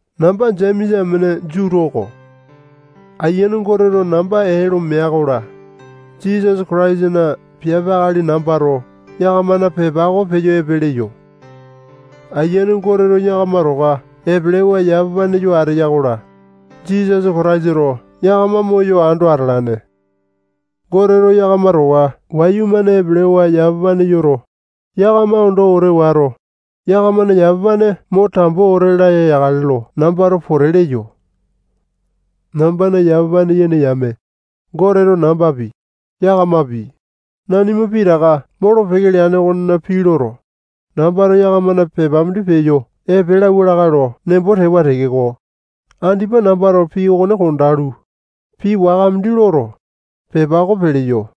Namba Jemesa amene Jutu oko. Ayiane Goteto namba ee lo mea-kola, Jisasa Kataisana piape akali nambato yakamana pepa oko peyo epe leyo. Ayiane Goteto yakama towa epelewa yamapane yo ateya-kola, Jisasa Kataisato yakama moyo ando atalane. Goteto yakama towa wayumane epelewa yamapane yoto, yakama ondo wete wato, yakamana yamapane mo tambo wete laya yakale lo nambato pote leyo. Nambana yamapane yene yame, Goteto nambapi, yakamapi, nanima pitaka molo-peke leane okona pii loto, nambato yakamana pepa mindi peyo epe lauwa lakae lo nembo tewa tekeko, andipa nambato pii okone kondalu, pii waka mindi loto, pepa oko peleyo.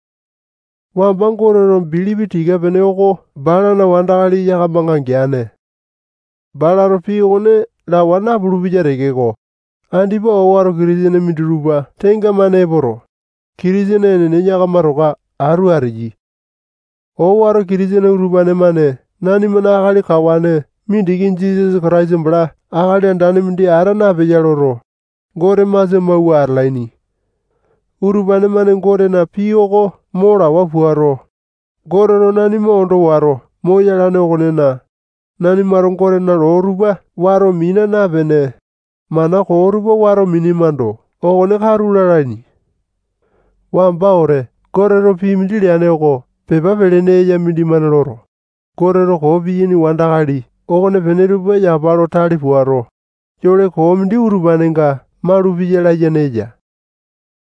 Wamba Goteto bilipi tika-pene oko balana wandakali yakamanga geane. Balato pii okone lawa napulu-peya tekeko, andipa owato Kitisene minditupa tenga-mane epoto, Kitisene enene yakama towa atu ateyai. Owato Kitisene utupane-mane nanimana akali kawane mindiki Jisasa Kataisa bala akali andane mindi ata napeya loto, Gote masia mawua atalaini. Utupane-mane Gotena pii oko mo lawa puato, Goteto nanima ondo wato moyalane okonena, nanimato Gotena loo tupa wato mina napene, mana koo tupa wato minemando, okone katu lalaini. Wamba wete Goteto pii mindi leane oko pepa pelene eya mindimane loto, Goteto koo piyaini wandakali okonepene tupa yapa lo tale puato, yole koo mindi utupanenga malupeya layene eya.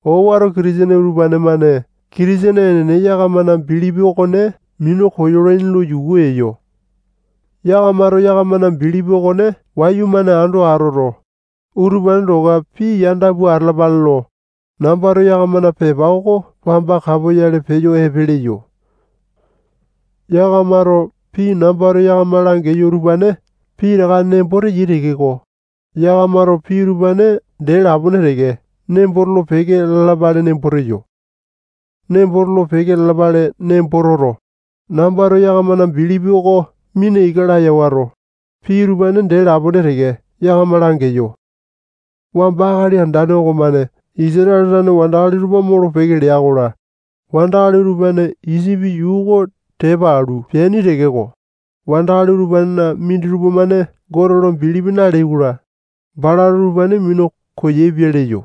Owato Kitisene utupane-mane Kitisene enene yakamana bilipi okone minu koyolaini lo yuku eyo. yakamato yakamana bilipi okone wayumane ando atoto, utupane towa pii yanda pua atalapale lo, nambato yakamana pepa oko wamba kapoyale peyo epe leyo. Yakamato pii nambato yakama langeyo utupane pitaka nembo teyai tekeko, yakamato pii utupane dee lapone teke nembo tolo-peke lalapale nembo teyo. Nembo tolo-peke lalapale nembo toto, nambato yakamana bilipi oko mina ika laya wato, pii utupane dee lapone teke yakama langeyo. Wamba Akali Andane okomane Isatale tane wandakali tupa molo-peke lea-kola, wandakali utupane Isipi yuu oko tepa alu peaini tekeko, wandakali utupanena minditupa-mane Gote lo bilipi naleai-kola, balato utupane minu koyaepia leyo.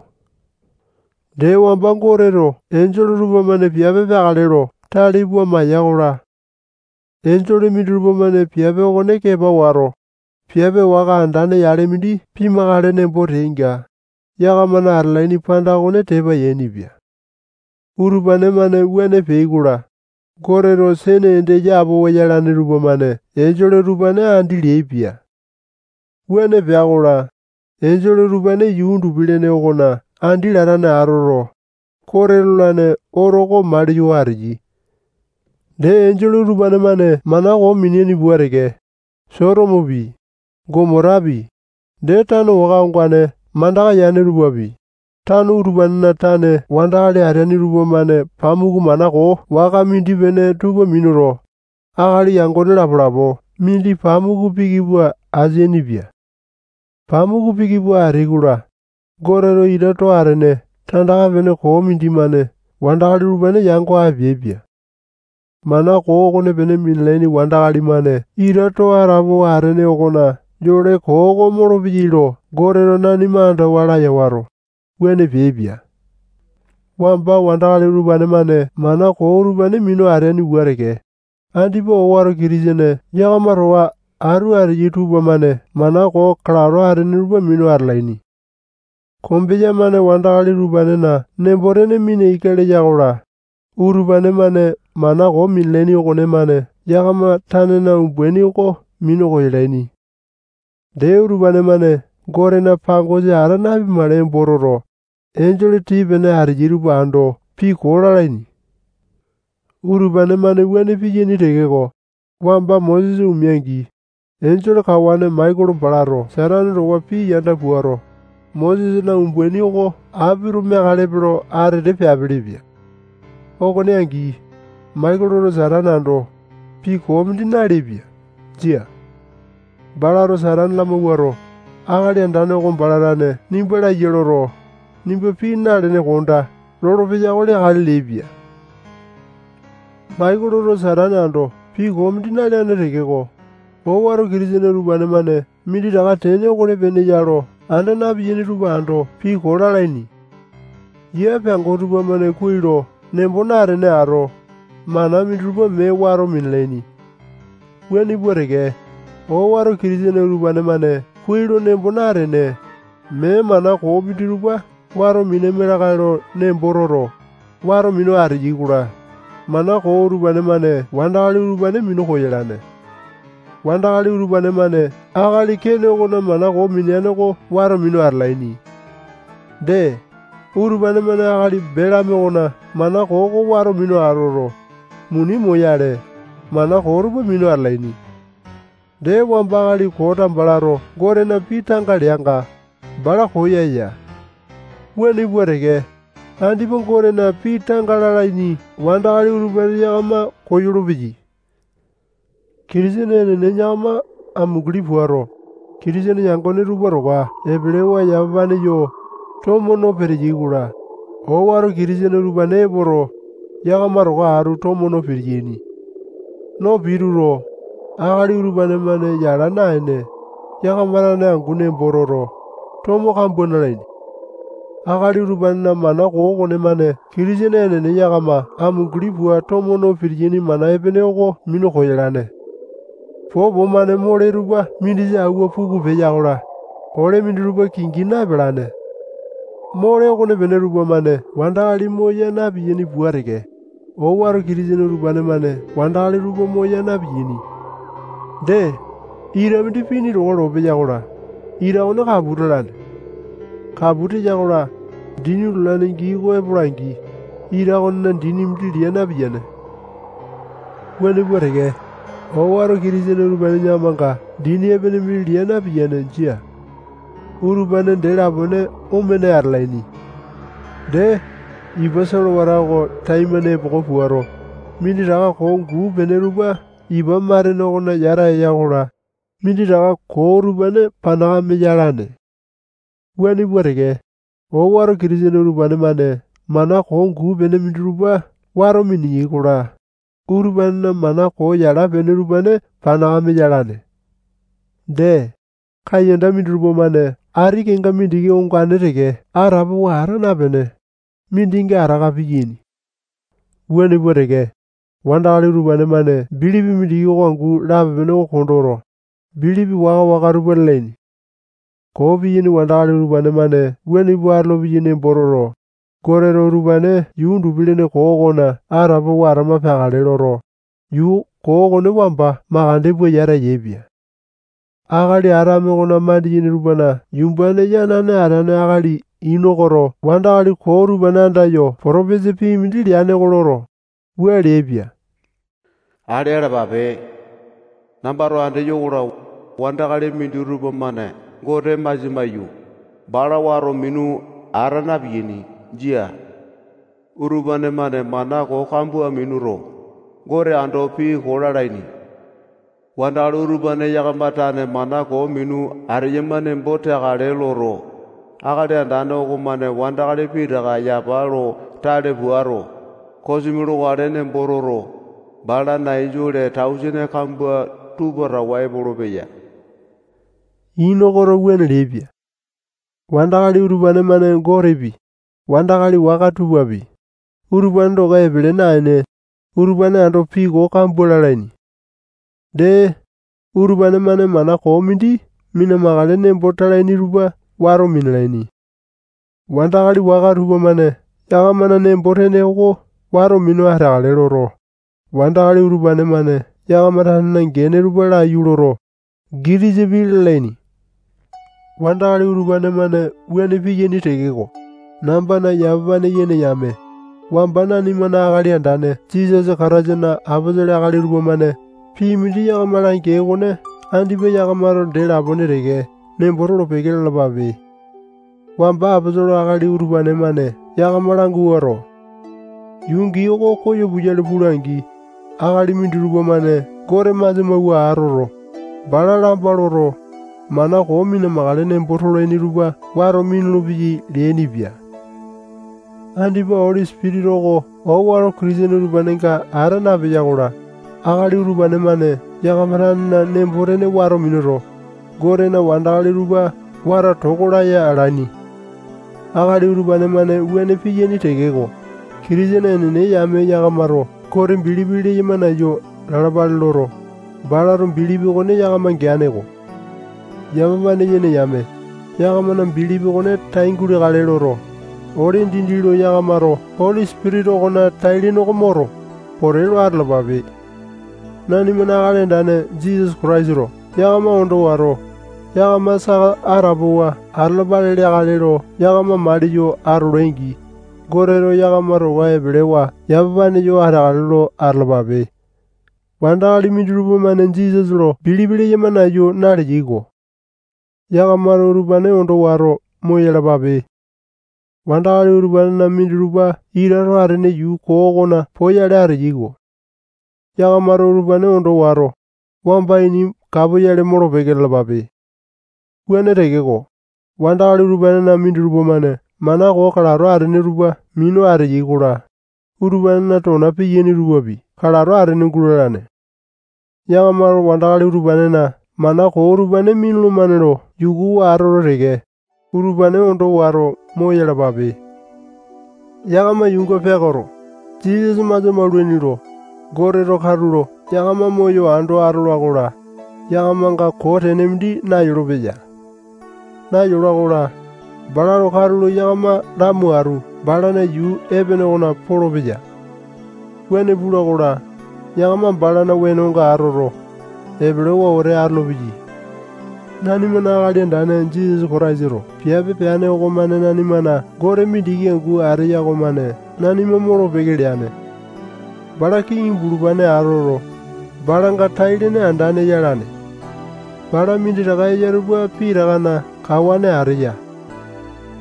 Dee, wamba Goteto enjole tupamane piape peakale lo tale pua maiya-kola, enjole minditupa-mane piape okone kepa wato, piape waka andane yale mindi pimakale nembo teainga, yakamana atalaini panda okone tepa yainipia. Utupane-mane wuane peai-kola, Goteto sene ende yapowa yalane tupamane enjole utupane andi leaipia. Wuane pea-kola, enjole utupane yuu undupi-lene okona andi latane atoto, kote lolane oto oko maliyo ateyai. Dee, enjole utupane-mane mana koo mineaini pua teke, Sotomopi, Gomotapi, dee tano waka ongane mandaka yane tupapi, tano utupanena tane wandakali ateaini tupamane pamuku mana koo waka mindi-pene tupa minuto, akali yangone lapo-lapo mindi pamuku piki pua ateapele-pia. Pamuku piki pua ateai-kola, Goteto ita too atene tandaka-pene koo mindimane wandakali utupane yango apeaipia. Mana koo okonepene minalaini wandakali-mane ita too atapowa atene okona yole koo oko molopeyai lo Goteto nanima andawa laya wato, wuane peaipia. Wamba wandakali utupane-mane mana koo utupane minu ateaini pua teke, andipa owato Kitisene yakama towa atu ateyai tupamane mana koo kalato atene tupa minu atalaini. Kombeya-mane wandakali utupanena nembo-tene mina ika leya-kola, utupane-mane mana koo minalaini okonemane yakama tanena umbaini oko minu koyalaini. Dee, utupane-mane Gotena pangosa ata napimakale nembo toto, enjole tii-pene ateyai tupa ando pii koo lalaini. Utupane-mane wuane piyaini tekeko, wamba Mosesa omea-angi, enjole kawane Maikolo balato Satane towa pii yanda puato, Mosesana umbaini oko apito meakalepe lo atete peapelepia. Okone angi, Maikoloto Satane ando, pii koo mindi naleaipia. Jia. Balato Satane lamawuato, Akali Andane oko bala tane nimba laiya loto, nimba pii nalene kondaa lolopeya oko leakale leaipia. Maikoloto Satane ando pii koo mindi naleane tekeko, owato Kitisene utupane-mane minditaka tene okonepene ya lo anda na-piyaini tupa ando pii koo lalaini. Yia peango tupamane kuai lo nembo natene ato, mana minditupa mee wato minalaini. Wuane pua teke, owato Kitisene utupane-mane kuai lo nembo natene, mee mana koo minditupa wato minaima lakae lo nembo toto, wato minu ateyai-kola, mana koo utupane-mane wandakali utupane minu koyalane. Wandakali utupane-mane akali Kene okona mana koo mineane oko wato minu atalaini. Dee, utupane-mane akali Belame okona mana koo oko wato minu atoto, muni moyale, mana koo tupa minu atalaini. Dee, wamba akali Kota balato Gotena pii tanga leanga, bala koyaya. Wuane pua teke, andipa Gotena pii tanga lalaini wandakali utupane yakama koyolo-peyai. Kitisene enene yakama amunguli puato, Kitisene yangone tupa towa epelewa yamapane yo, tomo no peteyai-kola, owato Kitisene utupane epoto, yakama towa atu tomo no pitiyaini. No pituto, akali utupane-mane yala naene, yakama tane angu nembo toto, tomo kambua nalaini. Akali utupanena mana koo okonemane Kitisene enene yakama amunguli pua tomo no pitiyaini mana epene oko minu koyalane. Popo-mane mole tupa mindisa awua puku peya-kola, ole minditupa kingi na-epalane. Mole okonepene tupamane wandakali moya na-piyaini pua teke, owato Kitisene utupane-mane wandakali tupa moya na-piyaini. Dee, ita mindi pini towa lopeya-kola, ita okone kapu talane. Kapu teya-kola, dini lulane gii oko epola-angi, ita okonena dini mindi lia napiyane. Wuane pua teke, owato Kitisene utupane yakamanga dini epene mindi lia napiyane. Jia. Utupane dee lapone omene atalaini. Dee, ipa solewata oko taimane epoko puato, minditaka koo guu-pene tupa ipa matene okona yata eya-kola, minditaka koo utupane panakame yalaini. Wuane pua teke, owato Kitisene utupane-mane mana koo guu-pene minditupa wato miniyai-kola, utupanena mana yala-pene utupane panakame yalane. Dee, kaiyanda minditupa-mane ati kenga mindiki ongane teke atapowa ata napene, mindinga ataka piyaini. Wuane pua teke, wandakali utupane-mane bilipi mindiki oko angu lape-pene oko kondoto, bilipi waka-waka tupa lalaini. Koo piyaini wandakali utupane-mane wuane pua atolopeyai nembo toto, Goteto utupane yuu undupi-lene koo okona atapowa atama peakale loto, yuu koo okone wamba makande pua yata yaepia. Akali Atame okona mandiyene tupana yumbane yanane ateane akali Inokoto wandakali koo utupane andayo potopesa pii mindi leane oko loto, wua leaipia. Ale alapape leaipia. Nambato andeyo-kola, wandakali minditupa-mane Gote masia maiyu, bala wato minu ata na-piyaini. Jia. Utupane-mane mana koo kambua minuto, Gote ando pii koo lalaini. Wandakali utupane yakama tane mana koo minu ateyama nembo teakale loto, Akali Andane okomane wandakali pitaka yapa lo tale puato, kosimi lokale nembo toto, balana enjole tausene kambua tupa towa epolopeya. Inokoto wuane leaipia. Wandakali utupane-mane Gotepi, wandakali waka tupapi, utupane towa epele naene, utupane ando pii koo kambua lalaini. Dee, utupane-mane mana koo mindi mina-makale nembo talaini tupa wato minalaini. Wandakali waka tupamane yakamana nembo-tene oko wato minu ateakale loto, wandakali utupane-mane yakama tanena gene tupa laiyu loto, gitisa pii lalaini. Wandakali utupane-mane wuane piyaini tekeko, nambana yamapane yene yame, wamba nanimana Akali Andane Jisasa Kataisana aposolo akali tupamane pii mindi yakama langeai okone andipa yakamato dee lapone teke nembo tolo-peke lalapape. Wamba aposolo akali utupane-mane yakama languato, yuu gii oko koyo puyale pula-angi, akali minditupa-mane Gote masia mawua atoto, bala lamba loto, mana koo mina-makale nembo tolaini tupa wato minulu-peyai leainipia. Andipa Oli Sipitisa oko owato Kitisene utupanenga ata napeya-kola, akali utupane-mane yakama tanena nembo-tene wato minuto, Gotena wandakali tupa wato toko laya alaini. Akali utupane-mane wuane piyaini tekeko, Kitisene enene yame yakamato Gote bilipi leyama nayu lalapale loto, balato bilipi okone yakama geane-ko. Yamapane yene yame, yakamana bilipi okone tai guleakale loto, ole dindi lo yakamato Oli Sipitisa okona tai-lene oko moto, pote lo atalapape. Nanimana Akali Andane Jisasa Kataisato yakama ondo wato, yakama saka atapowa atalapale leakale lo yakama maliyo atolai-angi, Goteto yakama towa epelewa yamapane yo ateakale lo atalapape. Wandakali minditupa-mane Jisasa lo bilipi leyama nayu naleyai-ko. Yakamato utupane ondo wato moyalapape. Wandakali utupanena minditupa ita too atene yuu koo okona poyale ateyai-ko. Yakamato utupane ondo wato, wamba ini kapoyale molo-peke lalapape. Wuane tekeko, wandakali utupanena minditupa-mane mana koo kalato atene tupa minu ateyai-kola, utupanena tona piyaini tupapi kalato atene gulalane. Yakamato wandakali utupanena mana koo utupane minulumane lo yukuwa atoto teke, utupane ondo wato, moyalapape. Yakama yuunga peakoto, Jisasa masia maulaini lo, Goteto katulo yakama moyo ando atola-kola, yakamanga koo tene mindi nayolopeya. Nayola-kola, balato katulo yakama lamo atu balana yuu epene okona polopeya. Wuane pula-kola, yakama balana wenonga atoto, epelewa wete olopeyai. Nanimana Akali Andane Jisasa Kataisato piape peane okomane nanimana Gote mindiki angu ateya okomane nanima molo-peke leane. Bala kiŋi bulupane atoto, balanga tai-lene andane yalane. Bala minditaka eya tupa pitakana kawane ateya.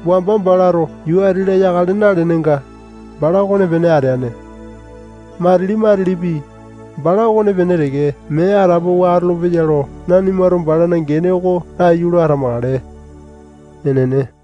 Wamba balato yuu ati-la yakale nalenenga, bala okonepene ateane. Matili-matilipi, bala okonepene teke mee atapowa atolopeya lo nanimato balana gene oko laiyu lo atamakale. Enene.